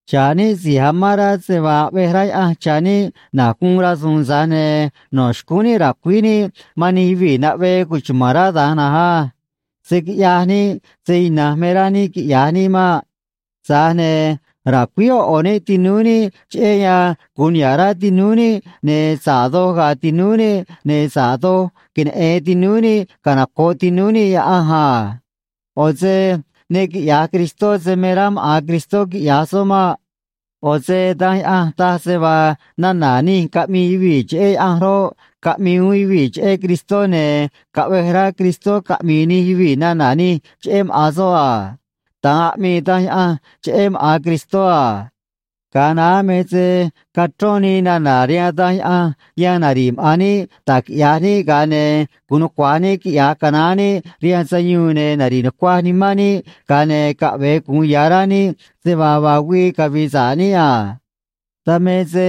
Xa̱ꞌ níꞌ si̱j amán rá se vaa aꞌvej rá Yaꞌanj cha̱ níꞌ na̱j guun rasu̱u̱n, tza̱j ne̱ no̱ xcúún níꞌ ra̱cuíj níꞌ man nij yuvii̱ naꞌvee cuchuma̱n rá da̱nj na̱nj á. Se̱ quiꞌyaj níꞌ se ina̱nj me rá níꞌ quiꞌya̱j níꞌ maꞌ. Tza̱j ne̱ ra̱cuíj ꞌo̱ ꞌo̱ níꞌ tinúú níꞌ, cheꞌé yan gu̱un niha̱ꞌ rá tinúú níꞌ, ne̱ sa̱ꞌ doj ga̱a̱ tinúú níꞌ, ne̱ sa̱ꞌ doj queneꞌe̱n tinúú níꞌ canoco̱ꞌ tinúú níꞌ Yaꞌanj a. ꞌO̱ se ne quiꞌya̱j Cristó se me rá maꞌa̱n Cristó quiꞌya̱j soꞌ maꞌ. ꞌO̱ se Danj Yaꞌanj taj se vaa nana̱ nij caꞌmii yuvii̱ cheꞌé Yaꞌanj roꞌ, caꞌmii uún yuvii̱ cheꞌé Cristó, ne̱ caꞌvej rá Cristó caꞌmi̱i̱ nij yuvii̱ nana̱ nij cheꞌé maꞌa̱n soꞌ a. Da̱nj aꞌmii Danj Yaꞌanj cheꞌé maꞌa̱n Cristó a. Ga̱a naá me se cachrón nii nana̱ rihaan Danj Yaꞌanj yan nari̱ꞌ maꞌa̱n níꞌ da̱j quiꞌya̱j níꞌ ga̱a ne̱ gu̱un nucua̱j níꞌ quiꞌya̱j canaán níꞌ rihaan sayuun ne̱ nari̱ꞌ nucuaj nimán níꞌ ga̱a ne̱ caꞌve̱e gu̱un ya̱ rá níꞌ se vaa vaa güii cavi̱i̱ sa̱ꞌ níꞌ a. Dan me se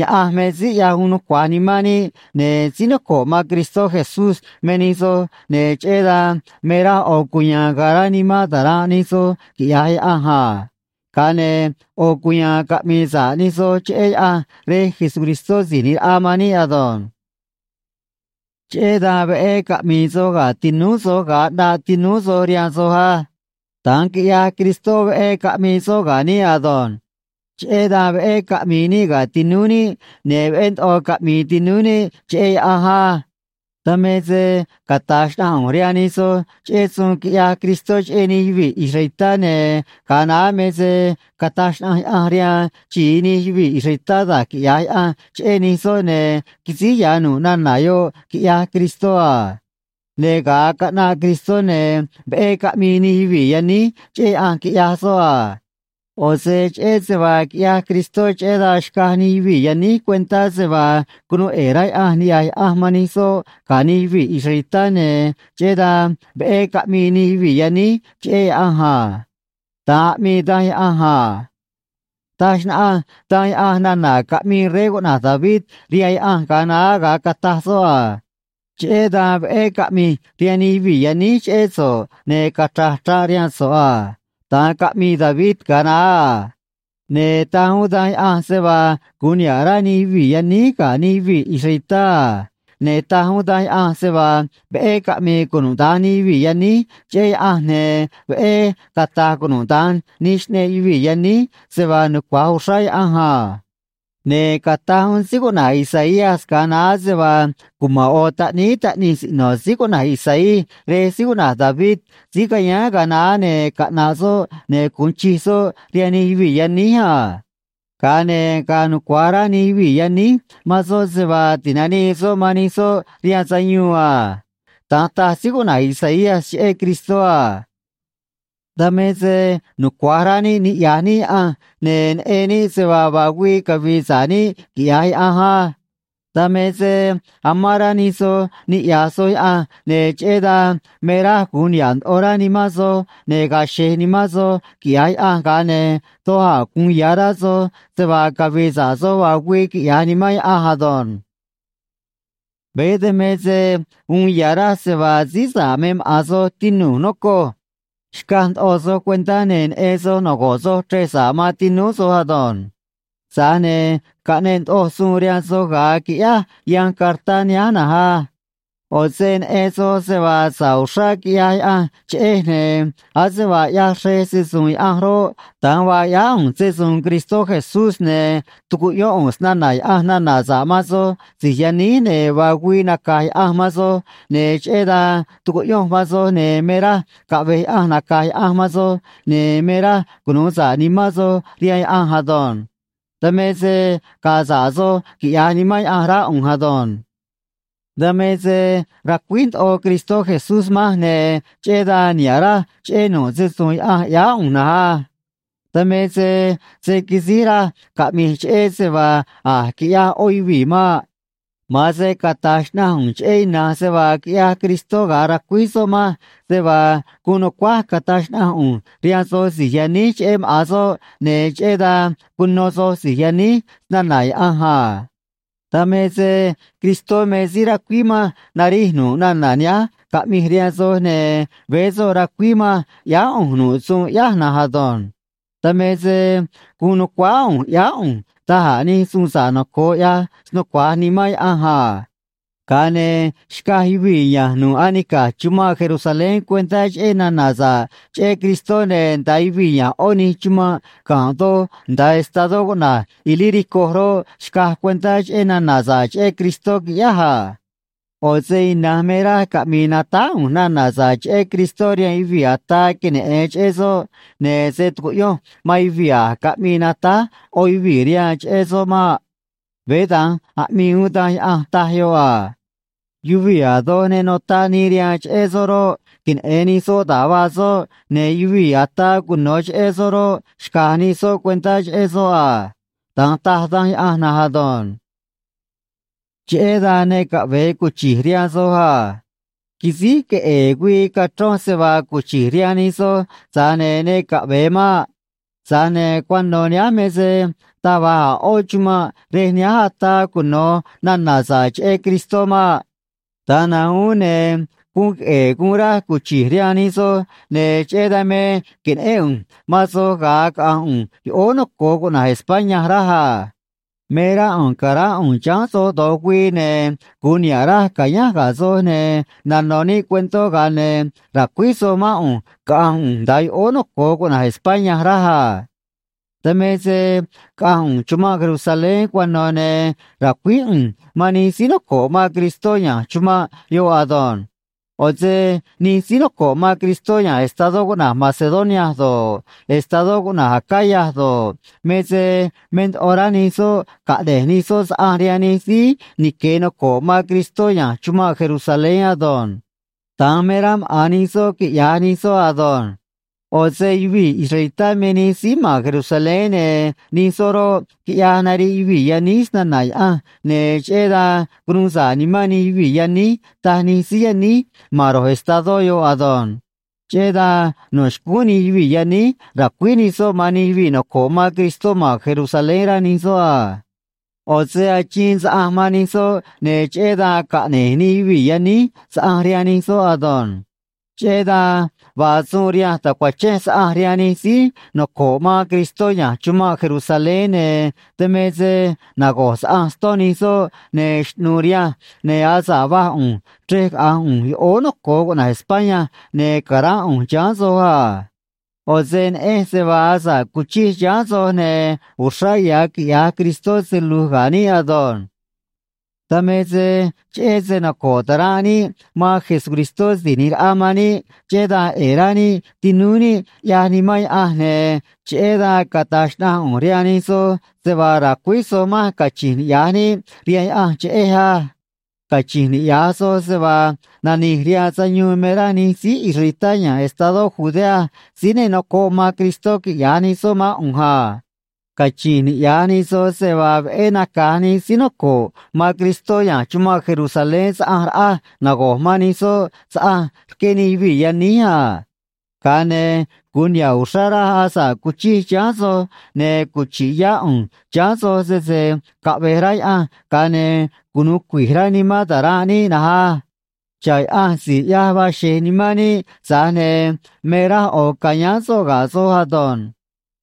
Yaꞌanj me síí ꞌyaj uun nucua̱j nimán níꞌ, ne̱ síí noco̱ꞌ man Cristó Jesús me nij soj, ne̱ cheꞌé dan me raj ꞌo̱ cuya̱a̱n ga̱a̱ rá nimán ta̱ranꞌ nij soj, quiꞌya̱j Yaꞌanj a. Ga̱a ne̱ ꞌo̱ cuya̱a̱n caꞌmi̱i̱ sa̱ꞌ nij soj cheꞌé Yaꞌanj Rej Jesucristó Si̱j ꞌNi̱j Raꞌa man níꞌ ado̱nj. Cheꞌé dan veꞌé caꞌmi̱i̱ soj ga̱ tinúú soj ga̱a ꞌnaꞌ tinúú soj rihaan soj á. Da̱nj quiꞌyaj Cristó, veꞌé caꞌmii soꞌ ga̱ níꞌ ado̱nj. Cheꞌé dan veꞌé caꞌmi̱i̱ níꞌ ga̱ tinúú níꞌ, ne̱ veꞌé ndoꞌo caꞌmi̱i̱ tinúú níꞌ cheꞌé Yaꞌanj á. Dan me se cata̱j xnaꞌanj ꞌu̱nj rihaan nij soj cheꞌé suun quiꞌyaj Cristó cheꞌé nij yuvii̱ israelitá, ne̱ ga̱a naá me se cataj xnaꞌanj Yaꞌanj rihaan xi̱i nij yuvii̱ israelitá da̱j quiꞌya̱j Yaꞌanj cheꞌé nij soꞌ, ne̱ quisíj ya̱ nu̱ꞌ nana̱ yoꞌ, quiꞌyaj Cristó a. Ne̱ ga̱a caꞌnaꞌ Cristó, ne̱ veꞌé caꞌmii nij yuvii̱ yaníj cheꞌé Yaꞌanj, quiꞌyaj soꞌ a. ꞌO̱ se cheꞌé se vaa quiꞌyaj Cristó, cheꞌé dan xcaj nij yuvii̱ yaníj cuentá se vaa cunuu ꞌe̱e̱ rá Yaꞌanj niꞌya̱j Yaꞌanj man nij soꞌ ga̱ nij yuvii̱ israelitá, ne̱ cheꞌé dan veꞌé caꞌmii nij yuvii̱ yaníj cheꞌé Yaꞌanj a. Da̱nj aꞌmii Danj Yaꞌanj a. Taj xnaꞌanj Danj Yaꞌanj nana̱ caꞌmii rey cuꞌna̱j David rihaan Yaꞌanj ga̱a naá, ga̱a cataj soꞌ a: Cheꞌé dan veꞌé caꞌmi̱j rihaan nij yuvii̱ yaníj cheꞌé so̱ꞌ, ne̱ cachra̱j chraꞌ rihaan so̱ꞌ a. Da̱nj caꞌmii David ga̱a naá a. Ne̱ taj uún Danj Yaꞌanj se vaa gu̱un niha̱ꞌ rá nij yuvii̱ yaníj ga̱ nij yuvii̱ israelitá a. Ne̱ taj uún Danj Yaꞌanj se vaa veꞌé caꞌmi̱i̱ cunuda̱nj nij yuvii̱ yaníj cheꞌé Yaꞌanj, ne̱ veꞌé cata̱j cunuda̱nj nij xꞌneꞌ yuvii̱ yaníj se vaa nucua̱j uxrá Yaꞌanj a. Ne̱ cataj uún síí cuꞌna̱j Isaías ga̱a naá se vaa cuma̱n ꞌo̱ taꞌníí taꞌnij siꞌno̱ síí cuꞌna̱j Isaí rej síí cuꞌna̱j David, síí cayáán ga̱a naá, ne̱ caꞌna̱ꞌ soꞌ, ne̱ gu̱un chij soꞌ rihaan nij yuvii̱ yaníj a. Ga̱a ne̱ ga̱a̱ nucua̱j rá nij yuvii̱ yaníj man soꞌ se vaa ti̱nanii soꞌ man nij soꞌ rihaan sayuun a. Da̱nj taj síí cuꞌna̱j Isaías cheꞌé Cristó a. Dan me se nucua̱j rá níꞌ niꞌya̱j níꞌ Yaꞌanj, ne̱ neꞌen níꞌ se vaa vaa güii cavi̱i̱ sa̱ꞌ níꞌ, quiꞌya̱j Yaꞌanj á. Dan me se amán rá nij soj niꞌya̱j soj Yaꞌanj, ne̱ cheꞌé dan me raj gu̱un niha̱ꞌ ndoꞌo rá nimán soj, ne̱ ga̱a̱ xe̱j nimán soj, quiꞌya̱j Yaꞌanj, ga̱a ne̱ doj a̱ gu̱un ya̱ rá soj se vaa cavi̱i̱ sa̱ꞌ soj vaa güii, quiꞌya̱j Nimán Yaꞌanj ado̱nj. Veé dan me se uun ya̱ raj se vaa síí sa̱ꞌ me maꞌa̱n soj, tinu̱j, nocoj. Xcaj ndoꞌo soj cuentá, ne̱ neꞌen soj nago̱ꞌ soj chrej sa̱ꞌ man tinúú soj ado̱nj. Tza̱j ne̱ caꞌneꞌ ndoꞌoj suun rihaan soj ga̱a quiꞌyáj yanj cartá nihánj na̱nj á. ꞌO̱ se neꞌen soj se vaa sa̱ꞌ uxrá quiꞌyaj Yaꞌanj cheꞌej, ne̱ ase vaa ꞌyaj xrej se‑su̱u̱n Yaꞌanj roꞌ, da̱nj vaa ꞌyáá ꞌu̱nj se‑su̱u̱n Cristó Jesús, ne̱ tucuꞌyón ꞌu̱nj snana̱ Yaꞌanj nana̱ sa̱ꞌ man soj si̱j yaníj, ne̱ vaa güii naca̱j Yaꞌanj man soj, ne̱ cheꞌé dan tucuꞌyonj man soj, ne̱ me raj caꞌve̱j Yaꞌanj naca̱j Yaꞌanj man soj, ne̱ me raj cunu̱u sa̱ꞌ nimán soj rihaan Yaꞌanj ado̱nj. Dan me se ga̱a̱ sa̱ꞌ soj, quiꞌya̱j Nimán Yaꞌanj rá ꞌu̱nj ado̱nj. Dan me se racuíj ndoꞌo Cristó Jesús manj, ne̱ cheꞌé dan niha̱ꞌ raj cheꞌé nu̱ꞌ se‑su̱u̱n Yaꞌanj ꞌyáá ꞌu̱nj na̱nj á. Dan me se se̱ quisíj raj caꞌmi̱j cheꞌé se vaa a̱j quiꞌyaj ꞌó yuvii̱ maꞌ. Ma̱an se cata̱j xnaꞌanj ꞌu̱nj cheꞌé ina̱nj se vaa quiꞌyaj Cristó ga̱a racuíj soꞌ manj se vaa guun nu̱cuáj cata̱j xnaꞌanj ꞌu̱nj rihaan soj si̱j yaníj cheꞌé maꞌa̱n soꞌ, ne̱ cheꞌé dan cuno soj si̱j yaníj snana̱ Yaꞌanj a. Dan me se Cristó me síí racuíj manj narij nu̱ꞌ nana̱ nihánj caꞌmij rihaan soj, ne̱ veé soꞌ racuíj manj ꞌyáá ꞌu̱nj nu̱ꞌ suun ꞌyáj na̱nj ado̱nj. Dan me se guun nu̱cuáá ꞌu̱nj ꞌyáá ꞌu̱nj da̱j a̱ nij suun sa̱ꞌ noco̱o, ꞌyaj snucua̱j Nimán Yaꞌanj a. Ga̱a ne̱ xcaj yuvii̱ ya̱nj nu̱ꞌ anica̱j chumanꞌ Jerusalén cuentá cheꞌé nana̱ sa̱ꞌ cheꞌé Cristó, ne̱ nda̱a yuvii̱ ya̱nj ꞌó nij chumanꞌ ga̱nꞌ doj nda̱a estadó cuꞌna̱j Ilírico roꞌ, xcaj cuentá cheꞌé nana̱ sa̱ꞌ cheꞌé Cristó, quiꞌyáj a. ꞌO̱ se ina̱nj me raj caꞌmi̱i̱ natáj ꞌu̱nj nana̱ sa̱ꞌ cheꞌé Cristó rihaan yuvii̱ ataa queneꞌe̱n cheꞌé soꞌ, ne̱ se̱ tucuꞌyonj man yuvii̱ a̱j caꞌmii natáj ꞌó yuvii̱ rihaan cheꞌé soꞌ maꞌ. Veé da̱nj aꞌmii uún Danj Yaꞌanj, taj yoꞌ a: Yuvii̱ a̱ doj ne notaꞌ nii rihaan cheꞌé soꞌ roꞌ, queneꞌe̱n nij soꞌ da̱j vaa soꞌ, ne̱ yuvii̱ ataa cuno̱ cheꞌé soꞌ roꞌ, xca̱j nij soꞌ cuentá cheꞌé soꞌ a. Da̱nj taj Danj Yaꞌanj na̱nj ado̱nj. Cheꞌé dan ne caꞌve̱e cuchi̱j rihaan soj a. Quisíj queꞌe̱e̱ güii cachronj se vaa cuchi̱j rihaan nij soj, tza̱j ne̱ ne caꞌve̱e maꞌ. Tza̱j ne̱ cuano̱ nihánj me se taj va̱j a̱ ꞌó chumanꞌ rej nihánj ataa cuno̱ nana̱ sa̱ꞌ cheꞌé Cristó maꞌ. Da̱nj na̱nj uún ne̱ guun queꞌe̱e̱ guun raj cuchi̱j rihaan nij soj, ne̱ cheꞌé dan me que̱neꞌén ꞌu̱nj man soj ga̱a caꞌa̱nj ꞌu̱nj yoꞌóó noco̱o cuꞌna̱j España, raj a. Me rá ꞌu̱nj ca̱ránꞌ ꞌu̱nj chiháán soj do̱j güii, ne̱ gu̱un niha̱ꞌ raj ca̱yánj ga̱ soj, ne̱ nano̱ níꞌ cuentó, ga̱a ne̱ ra̱cuíj soj mán ꞌu̱nj caꞌa̱nj ꞌu̱nj nda̱a yoꞌóó noco̱o cuꞌna̱j España, raj a. Dan me se caꞌa̱nj ꞌu̱nj chumanꞌ Jerusalén cuano̱, ne̱ ra̱cuíj ꞌu̱nj man nij síí noco̱ꞌ man Cristó ya̱nj chumanꞌ yoꞌ ado̱nj. ꞌO̱ se nij síí noco̱ꞌ man Cristó ya̱nj estadó cuꞌna̱j Macedonia do̱ꞌ, estadó cuꞌna̱j Acaya do̱ꞌ, me se me ndoꞌo rá nij soꞌ caꞌne̱j nij soꞌ saꞌanj rihaan nij síí nique̱ noco̱ꞌ man Cristó ya̱nj chumanꞌ Jerusalén ado̱nj. Da̱nj me rá maꞌa̱n nij soꞌ quiꞌya̱j nij soꞌ ado̱nj. ꞌO̱ se yuvii̱ israelitá me nij síí ma̱n Jerusalén, ne̱ nij soꞌ roꞌ, quiꞌyaj nariꞌ yuvii̱ yaníj snana̱ Yaꞌanj, ne̱ cheꞌé dan cunuu sa̱ꞌ nimán nij yuvii̱ yaníj, taj nij síí yaníj ma̱n ro̱j estadó yoꞌ ado̱nj. Cheꞌé dan no̱ xcúún nij yuvii̱ yaníj ra̱cuíj nij soꞌ man nij yuvii̱ noco̱ꞌ man Cristó ma̱n Jerusalén, rá nij soꞌ a. ꞌO̱ se achiin saꞌanj man nij soꞌ, ne̱ cheꞌé dan caꞌne̱j nij yuvii̱ yaníj saꞌanj rihaan nij soꞌ ado̱nj. Cheꞌé dan vaa suun rihanj ta̱cuachenj saꞌanj rihaan nij síí noco̱ꞌ man Cristó ya̱nj chumanꞌ Jerusalén, ne̱ dan me se nago̱j saꞌanj ston nij soꞌ, ne̱ xꞌnu̱u̱ rihanj, ne̱ asa̱ꞌ vaj ꞌu̱nj chrej caꞌa̱nj ꞌu̱nj yoꞌóó noco̱o cuꞌna̱j España, ne̱ ca̱ránꞌ ꞌu̱nj chiháán soj a. ꞌO̱ se neꞌenj se vaa asa̱ꞌ cuchij chiháán soj, ne̱ uxrá ya̱ quiꞌya̱j Cristó se lu̱j ga̱ níꞌ ado̱nj. Dan me se cheꞌé se noco̱ꞌ ta̱ranꞌ níꞌ man Jesucristó Si̱j ꞌNi̱j Raꞌa man níꞌ, cheꞌé dan ꞌe̱e̱ rá níꞌ tinúú níꞌ, ꞌyaj Nimán Yaꞌanj, ne̱ cheꞌé dan cata̱j xnaꞌanj ꞌu̱nj rihaan nij soj se vaa ra̱cuíj soj manj cachi̱nj niꞌya̱j níꞌ rihaan Yaꞌanj cheꞌej á. Cachi̱nj niꞌya̱j soj se vaa nani̱j rihaan sayuun me rá nij síí israelitá ya̱nj estadó Judea síí ne nocoꞌ man Cristó quiꞌya̱j nij soꞌ mán ꞌu̱nj a. Cachi̱nj niꞌya̱j nij soj se vaa veꞌé naca̱j nij síí noco̱ꞌ man Cristó ya̱nj chumanꞌ Jerusalén saꞌanj raꞌaj nago̱j man nij soꞌ saꞌanj rqué nij yuvii̱ yaníj a. Ga̱a ne̱ gu̱un niha̱ꞌ uxrá raj asa̱ꞌ cuchij chiháán soj, ne̱ cuchi̱ꞌ yá ꞌu̱nj chiháán soj, sese caꞌve̱j rá Yaꞌanj, ga̱a ne̱ cunu̱u cui̱j rá nimán ta̱ranꞌ níꞌ na̱nj á. Xa̱ꞌ Yaꞌanj si̱j ꞌyaj vaa xe̱j nimán níꞌ, tza̱j ne̱ me raj ꞌo̱ ca̱yáán soꞌ ga̱ soj ado̱nj.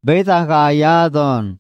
Veé da̱nj ga̱a̱ ya̱ ado̱nj.